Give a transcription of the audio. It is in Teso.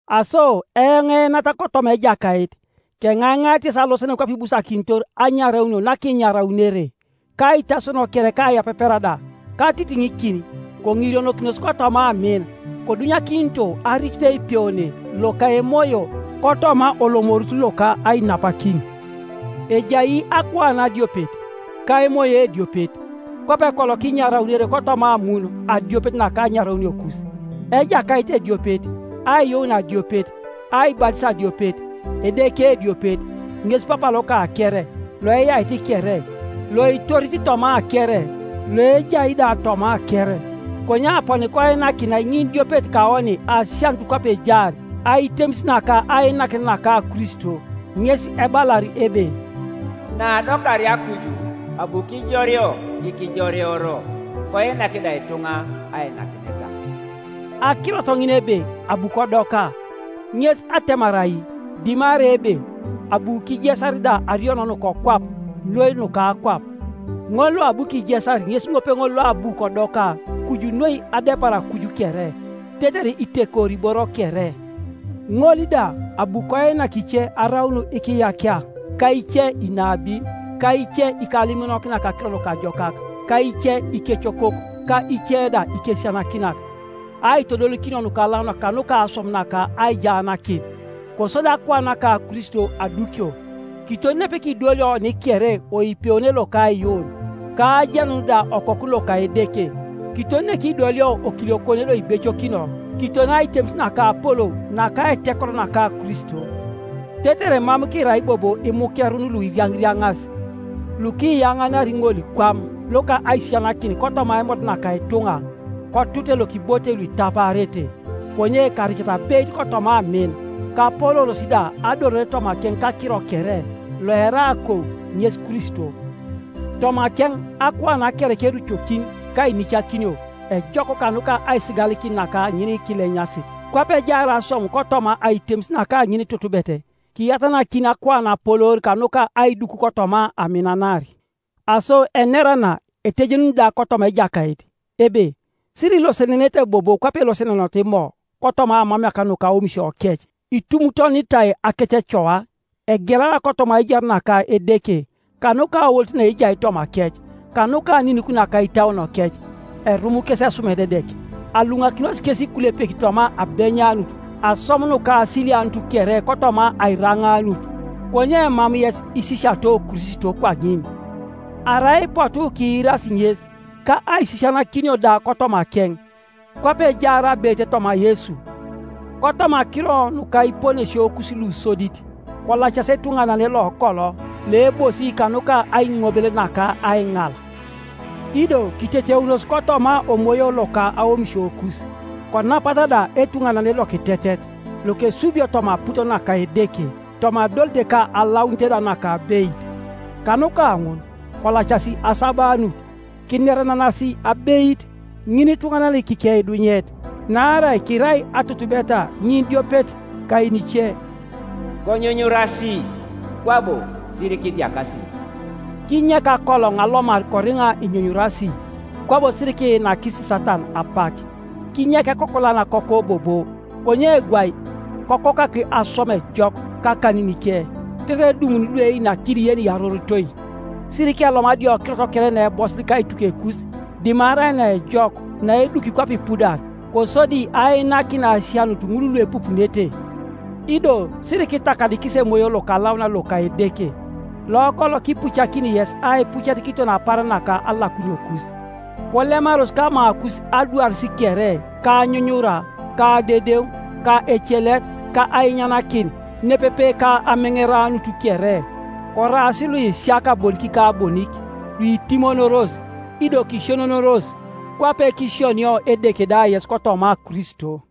Aso eoŋ eenat kotoma Ejakait, keŋaiŋait yes alosenen kwape ibusakinitor anyaraunio nakinyaraunere, kaitasono kere ka aiyapepera da, katitiŋikin, koŋirionokinos kotoma amin, kodunyakinito aricit eipeone loka Emoyo kotoma olomorut loka ainapakin. Ejai akuan adiopet, ka Emoyo ediopet, kwape kolo kinyaraunere kotoma amun adiopet naka anyarauniokus. Ejakait ediopet, aiyuun adiopet, aibatis adiopet. Edeke ediopet, ŋes Papa loka kere, loeyait kere, loitorit toma kere, loejai da toma kere. Konye aponi koinakinai ŋinidiopet kaoni asianut kwape ejaar aitemis naka ainakinet naka Kristo. Ŋes ebalar ebe, “Naadokaria kuju abu kijoreo ikijoreoro, Koinak da ituŋa ainakineta.” Akirot ŋin ebe, “Abu kodoka”, ŋes atemar ai dimarai ebe abu kijesar da ariino nukokwap noi nuka akwap? Ŋol loabu kijesar ŋes ŋopeŋol loabu kodoka kuju noi adepar akuj kere, tetere itekori iboro kere. Ŋol da abu koinak ice araun ikiyakia, ka ice inabin, ka ice ikalimonokinak Akiro Nukajokak, ka ice ikecokok, ka ice da ikesisianakinak, aitodolikinio lukalaunak kanuka aswam naka aijaanakin, kosodi akuan naka Kristo adukio; kiton nepekidolio oni kere oipeone loka aiyuun, ka ajenun da Okoku loka Edeke, kiton nekidolio okiliokone loibecokino, kiton aitemis naka apolou naka aitekoro naka Kristo; tetere mam kirai bobo imukerun luiriaŋiriaŋas, lukiyaŋanari ŋolikwam loka aisisianakin kotoma aimod naka ituŋa, kotute lokibotei luitapaarete. Konye karicata abeit kotoma amin, kapolooros da adolore tomakeŋ kakiro kere, loerai akou, ŋes Kristo. Tomakeŋ akuan kere kerucokin ka ainicakinio ejok kanuka aisigalikin naka ŋinikilenyasit, kwape ejaar aswam kotoma aitemis naka ŋinitutubet, kiyatanakini akuan apoloor kanuka aiduk kotoma aminanar. Aso enera na etejenun da kotoma Ejakait, ebe, sirilosenenete bobo kwape elosenenoto Imo, kotoma aamameak nuka aomisiokec; itumutonitai akececoa, egelara kotoma aijar naka Edeke kanuka aolit naejai tomakec, kanuka aninik naka itauonokec. Erum kes esumerededek, aluŋakinos kes ikulepek toma abenyanut aswam nukasilianut kere kotoma airaŋaanut, Konye mam yes isisiato Kristo kwaŋin, arai ipotu kiirasi ŋes, ka aisisianakinio da kotomakeŋ, kwape ejaar abeit toma Yesu. Kotoma akiro nuka iponesiokus lusodit, kolacasi etuŋanane lokolo, loebosi kanuka aiŋobel naka aiŋal, ido kiteteunos kotoma omoyo loka aomisiokus, konapata da etuŋanane lokitetet, lokesubio toma aput naka Edeke, toma adolit ka alaunit da naka abeit. Kanuka ŋun kolacasi asabanut kinerenenasi abeit, ŋinituŋanan kikeidunyet, naarai kirai atutubeta ŋinidiopet kayenice. Konyunyurasi, kwabo sirikidiakasi; kinyek akoloŋ alomar koriŋa inyunyurasi, kwabo sirikiinakis Satana apak. Kinyek ekokolan akoko bobo, konye gwai kokokak aswam ejok kakaninike, tetere edumuni lueinakini yeniyarorotoi. Sirikelomu adiokirot kere naebosit kaitukekus, dimarai naejok naeduki kwape ipudar, kosodi ainakin asianut ŋul luepupunete. Ido sirikitakadikis Emoyo Lokalaunan loka Edeke, lokolo kipucakini yes aipucet kiton apaaran naka alakuniokus. Kolemaros kamakus adwaris kere, ka anyunyura, ka adedeŋ, ka ecelet, ka ainyanakin, nepepe ka ameŋeranut kere, koraas luisiaka bonik ka bonik, luitimonoros, ido kisionionoros, kwape kisionio Edeke da yes kotoma Kristo.